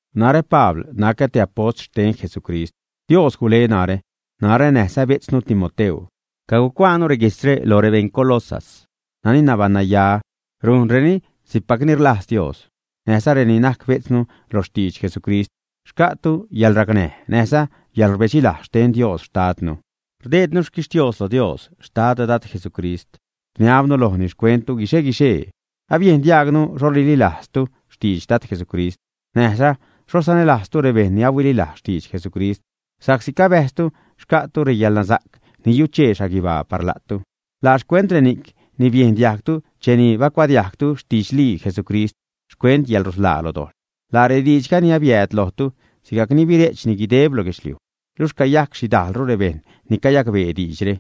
Narä, Pabl nacä te apost xten Jesucrist. Dios gule narä. Narä näjza bejtznu Timoteu cagucuaanu reguijtzre loj rebeṉ Colosas nani nabaṉnaya rujnreni si'cpacni rlajz Dios, näjza reni najc bejtznu lo xtidx Jesucrist. Xca'tu yäḻracnäj näjza yäḻrbedxilajz xten Dios xtadnu. Rdeednu xquixtios lo Dios xtad Dad Jesucrist rniabnu lojni xcuenttu guixe-guixee. Abiejn diajgnu xho rililajztu xtidx Dad Jesucrist, näjza xho sanälajztu rebejṉ ni ahuililajz xtidx Jesucrist, sa'csi cabäjztu xca'tu reyäḻnasa'c ni yuchee xhaguibaa par la'tu. Laa xcuent reni'c ni biejn diajgtu cheni bacuadiajgtu xtidxlii Jesucrist xcuent yäḻrusḻaa lo dojḻ. Laa rediidxga ni abiääd lojtu sigajc ni bire'chni guideb lo guedxliuj, luxh cayac xhidajlru rebejṉ ni cayacbee diidxre,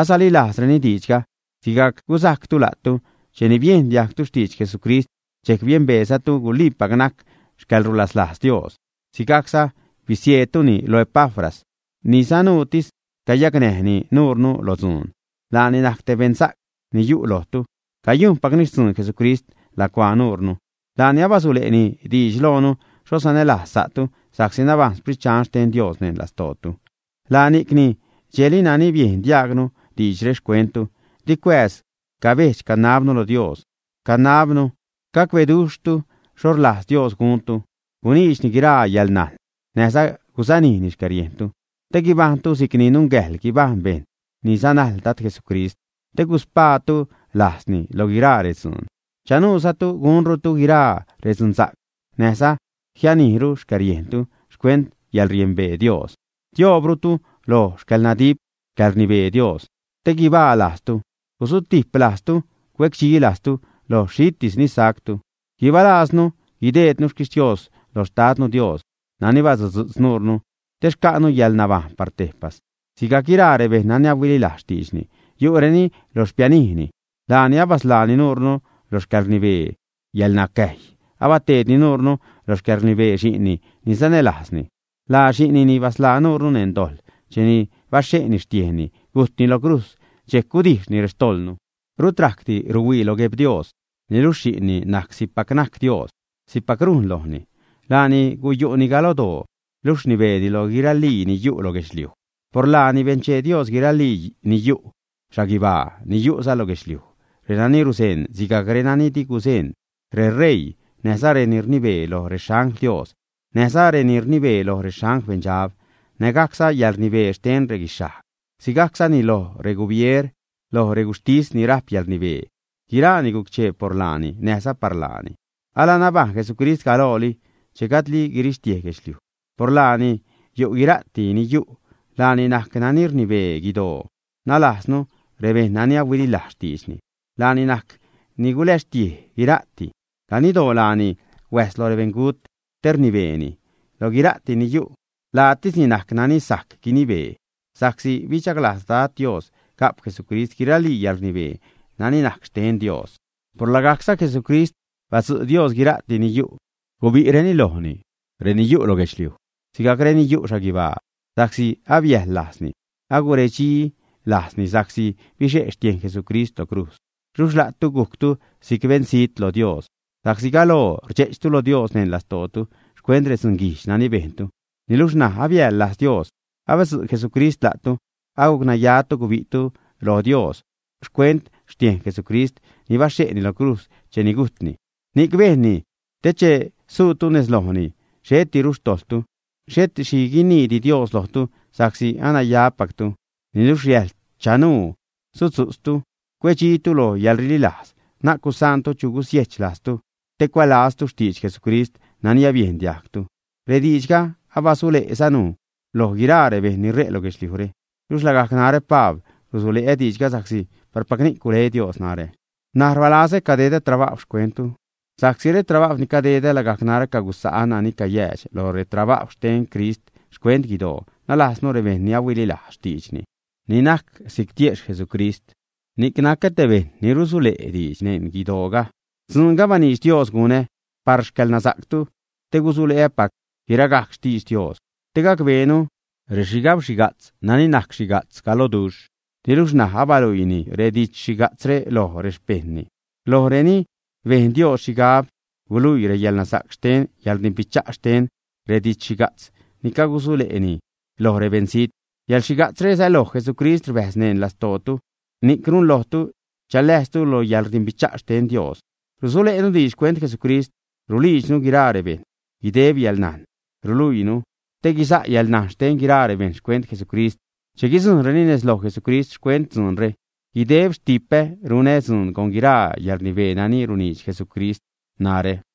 asalilajzreni diidxga, sigajc guzajctu la'tu. Cheni biejn diajgtu xtidx Jesucrist, dxejc biembeezatu guliipac najc xcäḻrulaslajz Dios. Sigajcza bisieedtuni lo Epafras, ni sanuutis cayacnäjni nuure lo dzuun. Laani najc te beṉsa'c, yu'ni lojtu cayujnpacni xtzuun Jesucrist lacuaa nuure. Laani abasule'ni diidx loonu xho sanälajz sa'tu sa'csi nabajṉ Sprit Dxan xten Dios neṉ lastootu. Laa ni'cni dxejli nani biejn diajgnu diidxre xcuenttu, di cuääz cabedx-canabnu lo Dios, canabnu gacbeduxhtu xho rlajz Dios guntu, guniidxni guiraa yäḻnajn näjza gusanijni xcäriejntu te guibajṉtu si'cni nungäjḻ guibajṉ bejṉ ni sanajl Dad Jesucrist, te guspaatu lajzni lo guiraa redzuun. Chanuuzatu gunrutu guiraa redzunsa'c näjza jianijru xcäriejntu xcuent yäḻriembee Dios. Tioobrutu loj xcäḻnadip, xcäḻrnibee Dios te guibaa lajztu gusutiplajztu, cue'cdxilajztu loj xhitis ni sajctu. Guibalajznu guideednu xquixtios loj xtadnu Dios nani basudzu'tz nuure te xca'nu yäḻnabajṉ par tejpas sigajc guiraa rebejṉ nani ahuililajz xtiidxni yu'reni lo xpianijni. Laani abasḻaani nuure loj xcäḻrnibee yäḻnacäjy, abateedni nuure lo xcäḻrnibee xi'nni ni sanälajzni. Laa xi'nni ni basḻaa nuure neṉ dojḻ cheni baxhe'ni xtiejnni, gujtni lo crujz, dxejc gudijxni rextojḻnu. Rut rajcdi ruhuii lo Gueb-Dios, niluxh xi'nni najc si'cpac najc Dios; si'cpac rujn lojni. Laani guyu'ni galodoo luxh rnibeeni lo guiralii ni yu' lo guedxliuj. Por laani benchee Dios guiralii ni yu' xhaguibaa ni yu'za lo guedxliuj, renani ruzeṉ sigajc renani di guzeṉ: reṟeii, näjza reni rnibee loj rexangl Dios, näjza reni rnibee loj rexangl beṉdxab, nägajcza reyäḻrnibee xten reguixhajg, sigajczani loj regubier, lo reguxhtis ni rajp yäḻrnibee, guiraani guc-chee por laani, näjza par laani. Alanabajṉ Jesucrist galooli, che gajdli guirixtiej guedxliuj. Por laani yu' guira'ti ni yu'. Laani najc nani rnibee guidoo, nalajznu rebejṉ nani ahuililajz xtiidxni. Laani najc ni guläxtiej guira'ti. Ganiddoo laani huäjs lo rebeṉgut te rnibeeni. Loj guira'ti ni yu' laatisni najc nani sajc guinibee. Sa'csi bidxaglajz Dad Dios ga'p Jesucrist guiralii yäḻrnibee nani najc xten Dios, por lagajcza Jesucrist badzu' Dios guira'ti ni yu', guibi'reni lojni, reni yu' lo guedxliuj sigajc reni yu' xhaguibaa, sa'csi abiäjḻ-lajzni, aguredxi lajzni sa'csi bixe' xtiejn Jesucrist lo crujz. Luxh la'tu gujctu si'c beṉzijt lo Dios sa'csi galoo rdxe'chtu lo Dios neṉ lastootu xcuent redzunguijdx nani bejntu. Niluxh ṉaj abiäjḻ-lajz Dios abadzu' Jesucrist la'tu, agucnayatu gubi'tu lo Dios xcuent xtiejn Jesucrist ni baxhe'ni lo crujz cheni gujtni. Ni'c bejnni te che suutu nez lojni, xhetiru xtojḻtu, xhet xhi guiniidi Dios lojtu sa'csi anayapactu. Niluxh riäjḻ chanuu sudzu'tztu, cuedxitu lo yäḻrililajz. Na'c gusaantu chu gusiejch-lajztu te cuälaztu xtidx Jesucrist nani abiejn diajgtu. Rediidxga abasule'zanu loj guiraa rebejṉ ni ṟe' lo guedxliujre. Luxh lagajc narä, Pabl rusule'ä diidxga sa'csi parpac ni'c gule Dios narä. N̲aj rbalazä cadedä trabajw xcuenttu sa'csi retrabajw ni cadedä lagajc narä cagusa' nani cayäädx lo retrabajw xten Crist xcuent guidoo, nalajznu rebejṉ ni ahuililajz xtiidxni, ni najc si'c tiejxh Jesucrist. Ni'c nacä te bejṉ ni rusule' diidx neṉ guidooga. Dzuunga baniidx Dios gunä par xcäḻnasa'ctu te gusule'äpac guiragajc xtidx Dios, te gacbeenu rexhigabxhiga'tz nani najc xhiga'tz galododuxh niluxh ṉaj abaluiini redidx-xhiga'tzre loj rexpejṉni. Lojreni bejn Dios xhigab guluiini reyäḻnasa'c xten yäḻrdimbicha' xten redidx-xhiga'tz ni cagusule'ni loj rebeṉzijt. Yäḻxhiga'tzre säloj Jesucrist rbäjz neṉ lastootu ni'c runlojtu chaläjztu lo yäḻrdimbicha' xten Dios. Rusule'nu diidx xcuent Jesucrist, ruliidxnu guiraa rebejṉ, guideb yäḻnajn ruluiinu te guisa' yäḻnajn xten guiraa rebejṉ xcuent Jesucrist che guidzujṉreni nez loj Jesucrist. Xcuent dzuunre guideb xtipä runä dzuun con guiraa yäḻrnibee nani runiidx Jesucrist narä.